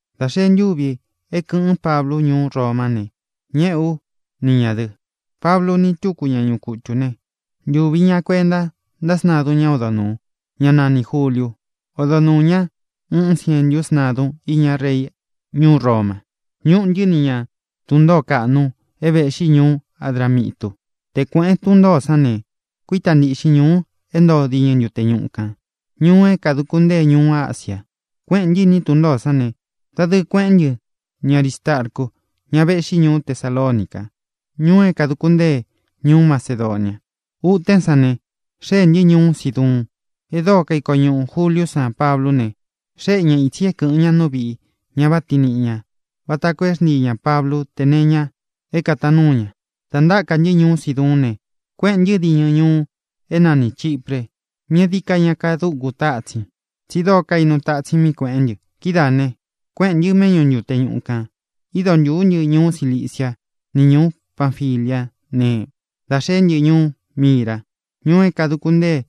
Dā xee ntúvī é kɨ̄ꞌɨ́n Pablu ñuú Romá ne, ñéꞌē ú ni ñā dɨ. Pablu ni túku ñá ñuꞌu kutū ne, ntūvi ña kuenta ntáꞌa sntadun ñá odo nūu, ñá nanī Juliu. Odo nuū ñá uun sientú sntadun íña rei ñuú Roma. Ñúꞌū ntɨ́ ni ña tun ntōó kaꞌnu é vēꞌxí ñuú Adramitu. Te kuēꞌén tun ntōó san ne, kuítā ntiꞌxin ñuu é ntoo diñɨ ntute ñuꞌu kān, ñuu é kāduku ntée ñuú Asia. Kuéꞌēn ntɨ́ iní tun ntōó san ne, dadɨɨ kueꞌén ntɨ ni Arīstarcu, ña véꞌxi ñuú Tesalonica, ñuu é kāduku ntée ñuú Macedonia. Utén san ne, xéē ntɨ́ ñuú Siduun. E dóo kaiko ñuꞌū Juliú san Pablú ne, xéꞌe ña ītsi é kɨ̄ꞌɨ́n ña nú viꞌī ña váꞌa tiin niꞌi ñā vata koo é xntii ñā Pablú tē nee iña é kātaan núu ña. Dā ntáka ntɨ́ ñuú Siduún ne, kuéꞌēn ntɨ́ diñɨ ñuu é nanī Chipre, mí e dií ka ña kadúku tatsin, tsí dóo kainu tatsin mí kueꞌén ntɨ. Kidáā ne, kuéꞌēn ntɨ́ méꞌñu ntute ñuꞌu kān, ído ntūú ntɨ ñuú Cilicia ni ñūú Panfiliá ne, da xée ntɨ́ ñuú Mira, ñuu é kāduku ntée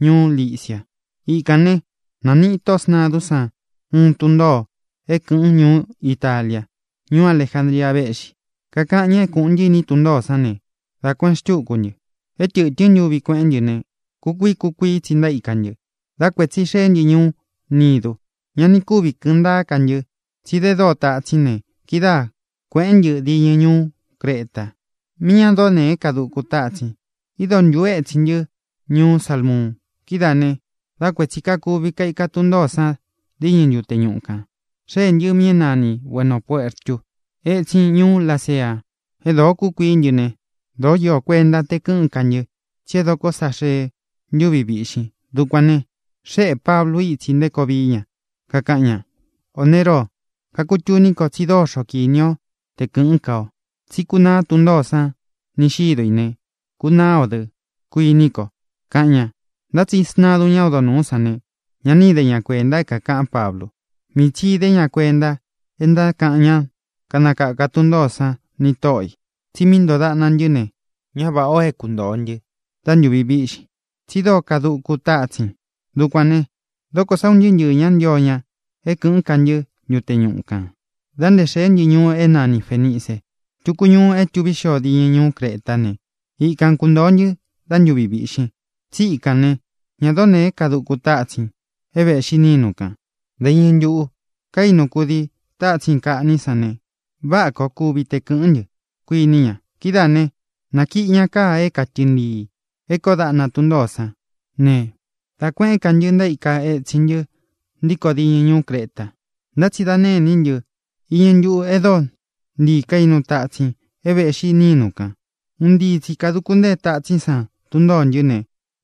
ñuú Licia. Ikān ne, naníꞌi tóꞌō sntadún san uun tun ntōo é kɨ̄ꞌɨ́n ñuú Italia. Ñuú Alejandria véꞌxi. Kakaꞌan ñá é kūꞌun ntɨ́ iní tun ntōó san ne, dá kuēꞌen xtúku ntɨ. É tɨ̄tɨ́n ntuvi kueꞌén ntɨ ne, kukuií kukuií tsi ntaíka ntɨ. Dá kuētsi xeé ntɨ ñuú Nidu. Ña ni kúvi kɨ̄ꞌɨn ntáa ká ntɨ, tsi de dóo tatsín ne, kidáa kuēꞌén ntɨ diñɨ ñuú Creta, mí ña dóo nēé kaduku tatsin. Ído ntūú etsin ntɨ́ ñuú Salmuun. Kidáā ne, dá kuētsi kakuvi kaika tun ntōó san diñɨ ntute ñuꞌu kān, xéē ntɨ́ mí é nanī Bueno Puertu, étsin ñuú Lasea. E dóo kúkuií ntɨ ne, dōó īó kuenta te kɨꞌɨ́n ka ntɨ, tsí e dokó sa xee ntúvi víꞌxin. Dukuān ne, xéꞌē Pablu ítsi nté koo vií ña, kakaꞌan ña: —Ō ne, róo, kakutuní ko tsí dóxo kini o te kɨ̄ꞌɨ́n ka ō. Tsí kunaá tun ntōó san ni xīdó i ne, kunaá ō dɨ́, kuiní ko —kaꞌan ña. Ntá tsi sntadun ñá odo nūú san ne, ña ni íde ña kuēnta é kākaꞌán Pablu. Mii tsi īde ña kuenta é ntákaꞌan ñá kanakāká tun ntōó san nī tóꞌo ī. Tsi mí ntoo daꞌna ntɨ́ ne, ñá vāꞌá o é kuntōo ntɨ́ dá ntūvi víꞌxin, tsí dóo kaduku tátsin. Dukuān ne, dókō sá un ntɨɨ́ ntɨɨ̄ ñá ntio ña é kɨ̄ꞌɨ́n ka ntɨ́ ntute ñuꞌu kān da nté xēé ntɨ ñuu é nani Fēnice, túku ñuu é tuví xio diñɨ ñuú Cretá ne, ikan kuntōo ntɨ́ dá ntūvi víꞌxin. Tsí ikān ne, ña dóo nēé kaduku tatsin é vēꞌxi nínu kān. Dā iñɨ ntuꞌu kaínu kudii tatsin kaꞌní san ne, váꞌa koo kuvi te kɨ̄ꞌɨ́n ntɨ, kuiní ña. Kidáā ne, nakiꞌi ña káa é katɨɨn ntiī é kōó daꞌna tun ntōó san ne, dá kuēꞌén ka ntɨ, ntaíka etsin ntɨ́ ntíkō diñɨ ñuú Creta. Ntá tsi da nêní ntɨ iñɨ ntuꞌu é dóo ntii kainu tatsin é vēꞌxi nínu kān. Un ntii tsi kāduku ntée tatsín san tun ntōó ntɨ ne,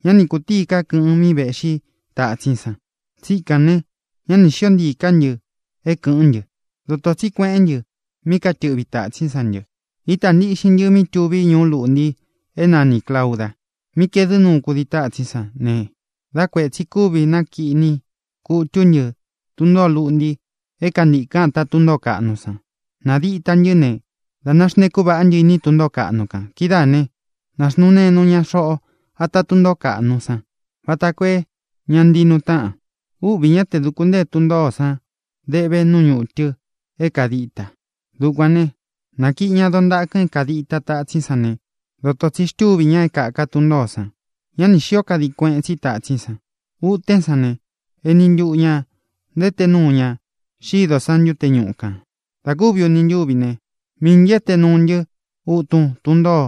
ñá ni kūtíi ka kɨꞌɨn mí vēꞌxí tatsín san. Tsíkān ne, ñá ni xīó ntiī ká ntɨ é kɨ̄ꞌɨ́n ntɨ. Dotō tsí kueꞌén ntɨ mí katɨꞌvi tātsín san ntɨ. Ítā ntiꞌxin ntɨ mí tuví ñuú luꞌnti é nanī Clauda, mí kaedɨ́ nuu kudii tatsín san ne, dá kuētsi kúvi nákiꞌni kutú ntɨ tun ntōó luꞌnti é kāntikɨn áta tun ntōó kaꞌnu san. Nādita ntɨ́ ne, dā náxntēkú vaꞌá ntɨ iní tun ntōó kaꞌnu kān. Kidáā né, nāxnuu nenu ña xoꞌo ata tún ntōó kaꞌnu san vata koo é ña ntii nuu táꞌan. Úꞌvī ñá te dūku ntée tun ntōó san deꞌve nú ñutɨ é kādita. Dukuān ne, nakíꞌi ña doo ntakɨn é kādita tatsín san ne, dotō tsí xtuvi ñá é kāka tun ntōó san. Ñá ni xīó kadin kueꞌén tsi tatsín san. Utén san ne, eni ntuꞌu ñā ntaété nuu ña xido san ntute ñúꞌu kān. Dā kúvi uni ntúvi ne, miī ntɨ́ éte nuu ntɨ́ utun tún ntoo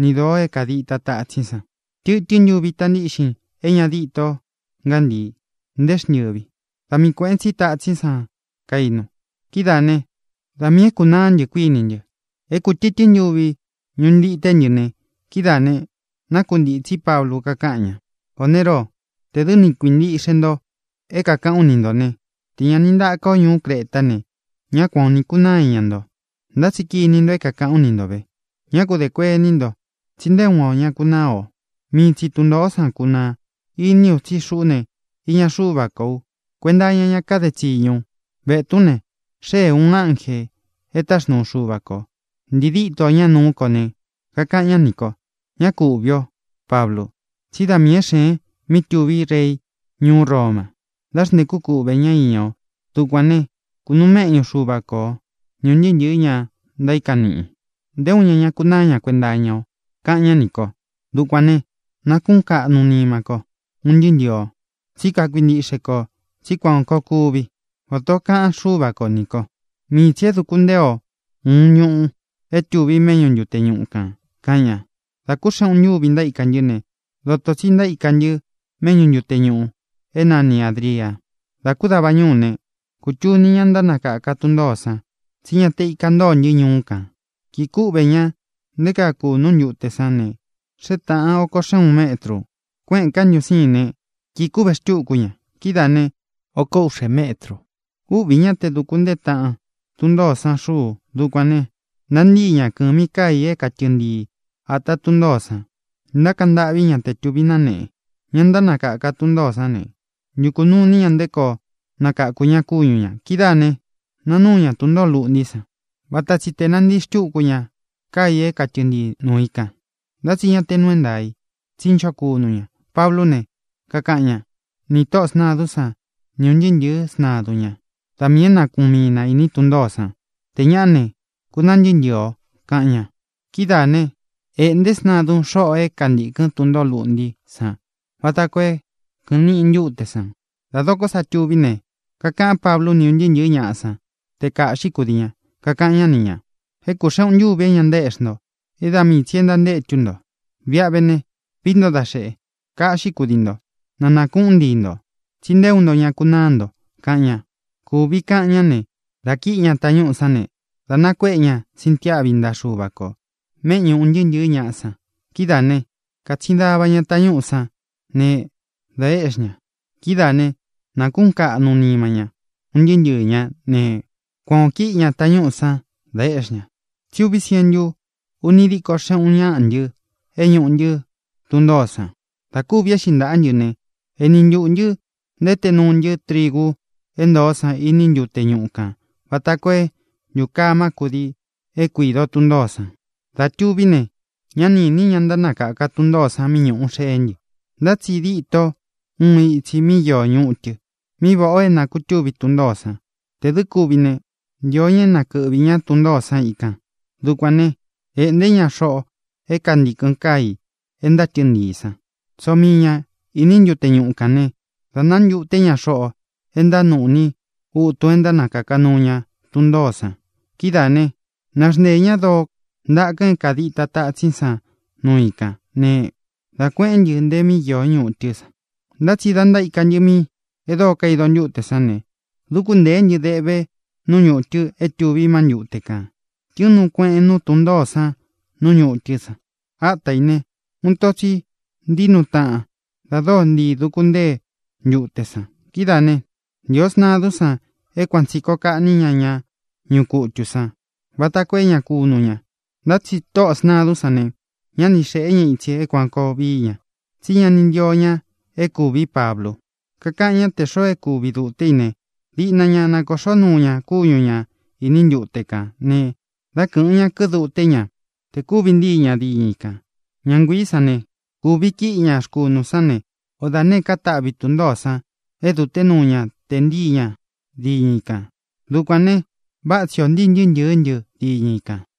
ni dōo é kādita tatsín san. Tɨtɨ́n ntuvi ita ntíꞌxin e ña díto ngántii, nté xntɨvi. Da mii kuēꞌen tsí tatsín san kainu. Kidáā né, da miī é kunaá ntɨ, kuiní ntɨ. É kū tɨtɨ́n ntuvi ñuꞌu ntité ntɨ ne, kidáā ne, nákuntītsí Pablu, kakáꞌan ña: —Ō ne, róo, tē dɨ́ ni kuintíꞌxe nto é kākaꞌán u ni ntō né, tē ña ni ntáka o ñuú Cretá ne, ñá kuan ō ni kunáa iña nto. Ntá tsi kiní nto é kākaꞌán u ni ntō ve: Ñá ku dē kuení nto, tsí nté uun ō ñá kunáa o. Mii tsi tun ntōó san kunaa. Iní u, tsí xuꞌú ne, iña Xúva kō u; kuenta iña ñá kade tsiñu u. Vetún ne, xée ūun ánjē e táxnuu Xuva kō, ntii díto ña nuú ko ne, kakaꞌan ñá nī ko: “Ña ku úꞌvī ó, Pablu, tsí da miī é xēen mí tuví rei ñuú Roma da nté xntēkú kuꞌvē ñá iña o. Dukuān ne, kunuu méꞌñu Xuva ko o ni ūn ntɨɨ́ ntɨ̄ɨ́ ña ntaíkan niꞌin. Nté uun ña ña kunáa ña kuenta iña o”, kaꞌan ñá nī ko. Dukuān ne, nákuꞌūn kaꞌnu nima ko, un ntɨɨ́ ntɨɨ̄ o. Tsí kakuintiꞌxe ko tsí kuan koo kuvi vata ō kaꞌan Xúva ko nī ko. Mii tsī é dūku ntée o uun ñuu é tuvi méꞌñu ntute ñuꞌu kān —kaꞌan ña. Dā kú xeꞌun ntúvi ntaíka ntɨ́ ne, dotō tsí ntaíka ntɨ́ méꞌñu ntute ñūꞌu é nanī Adria. Dā kú dava ñúu ne, kūtuni ñá ntánakaka tun ntōó san tsí ña te íka ntōo ntɨ́ ñuꞌu kān. Kīꞌi kúꞌvē ña nté kaa kūnú ntute sán ne, xée tāꞌan oko xeꞌun uun métrū. Kuéꞌēn ká ntɨ un sīin né, kīꞌi kúꞌve xtúku ña. Kidáā ne, oko úꞌxē métrū. Úꞌvī ñá te duku ntée taꞌan tun ntōó san xuu. Dukuān ne, nantíi ña kɨ̄mi káa ī é katɨɨn ntii āta tún ntōó san, ntákaꞌan ntâꞌví ña te tūví náneꞌe. Ña ntánakaka tun ntōó san ne, ntukū nuu iní ña nté koo nakakū ña kúñu ñā. Kidáā ne, nanúu ña tun ntōó luꞌntí san vata tsi te nantii xtúku ña káa ī é katɨɨn ntii nuu i kan. Ntá tsi ña te nuu é ntaā i, tsí ncho kunu ña. Pablú ne, kakaꞌan ñá nī tóꞌō sntadún san ni ūn ntɨɨ́ ntɨ̄ɨ́ sntadun ña: —Da miī é nakuꞌun mii na īní tun ntōó san. Tē ñaꞌá ne, kunaa ntɨɨ́ ntɨɨ̄ o —kaꞌan ña. Kidáā né, ēꞌnté sntadún xoꞌo é kantīkɨn tún ntōó luꞌntí san vata koo é kɨꞌɨn niꞌi ntuté san. Dā dokó sa tuví ne, kakaꞌán Pablu ni ūn ntɨɨ́ ntɨ̄ɨ́ ñaꞌa san te kāꞌxi kúdii ña. Kakaꞌan ñá ni ñā: —É kū xeꞌun ntúvi é ña ntaéꞌxi nto, é da mii tsī é ntántétu nto. Viꞌa ve ne, vií nto da xeꞌe, kaꞌxí kudii nto, na nākuꞌún ntii ntō, tsí nté uun nto ña kunáa nto —kaꞌan ña. Kūvi kaꞌan ñá ne, dā kíꞌi ña tañúꞌū sán ne, dā nakuéꞌe ña sintiáꞌvi ntaꞌa Xuva kō méꞌñu ūn ntɨɨ́ ntɨ̄ɨ́ ñaꞌa san. Kidáā né, kātsin dava ña tañúꞌū sán ne, dā éꞌxi ña. Kidáā ne, nákuꞌūn kaꞌnu nima ña, un ntɨɨ́ ntɨɨ̄ ñá ne, kuan ō kíꞌi ña tañúꞌū sán, dā éꞌxi ñā. Tsí uví sientu úni díkō xéꞌun uun ñaꞌa ntɨ é ñūꞌu ntɨ́ tun ntōó san. Dā kúvi éꞌxi ntaꞌa ntɨ́ ne, eni ntuꞌū ntɨ́ ntaété nuu ntɨ́ trigu é ntoó san iní ntute ñuꞌu kān vata koo é ntūkamá kudii é kuido tun ntōó san. Dā tuví ne, ñá ni īni ñá ntánakaka tun ntōó san míꞌi ñuú xeé ntɨ. Ntá tsi díto uun itsī mí īó ñutɨ, mí vāꞌá o é nākutúvi tun ntōó san. Tē dɨ́ kuvi ne, ntío ña é nakɨꞌvī ñá tun ntōó san ikān. Dukuān né, ēꞌnté ña xoꞌō é kāntikɨn káa i é ntátɨɨn ntiī sán, tsóo mii ña īní ntute ñuꞌu kān né, dā nántuté ña xoꞌo é ntánuꞌní utun é ntánakaka nuu ña tun ntōó san. Kidáā ne, náxnteē ñá doo ntakɨn é kādita tatsín san núu i kān ne, dá kuēꞌén ntɨ nte mí īó ñutɨ́ san. Ntá tsi dā ntaíka ntɨ mí e dóo kaido ntute sán ne, dúku ntēé ntɨ deꞌve nú ñutɨ é tuví má ntute kān. Tɨ̄ɨn nuu kueꞌen núu tun ntōó san nú ñutɨ́ san. Áta ī ne, uun ito tsi ntíi nuu taꞌan da dóo ntiī duku ntée ntute san. Kidáā né, ntīo sntadún san é kuan tsī koo kaꞌní ña ña ñuꞌu kutū sán vata koo é ña kunu ña. Ntá tsi tóꞌō sntadún san ne, ñá ni xēꞌé ña itsi é kuān koo vií ña, tsí ña ni ntío ña é kūví Pablu. Kakaꞌan ñá tē xoo é kūvi duté i ne, diꞌna ña nakoꞌxó nuu ña kúñu ña īní ntute kān ne, dá kɨ̄ꞌɨn ña, kiduté ña te kūvi ntii ña diñɨ i kān. Ña nguiī sán ne, kūvi kíꞌi ña rkunū sán ne, o da nēé ka taꞌvi i tun ntōó san é dute núu ña tē ntíi ña diñɨ i kān. Dukuān ne, váꞌa tsi ō ntíi ntɨɨ́ ntɨ̄ɨ́ ntɨ diñɨ i kān.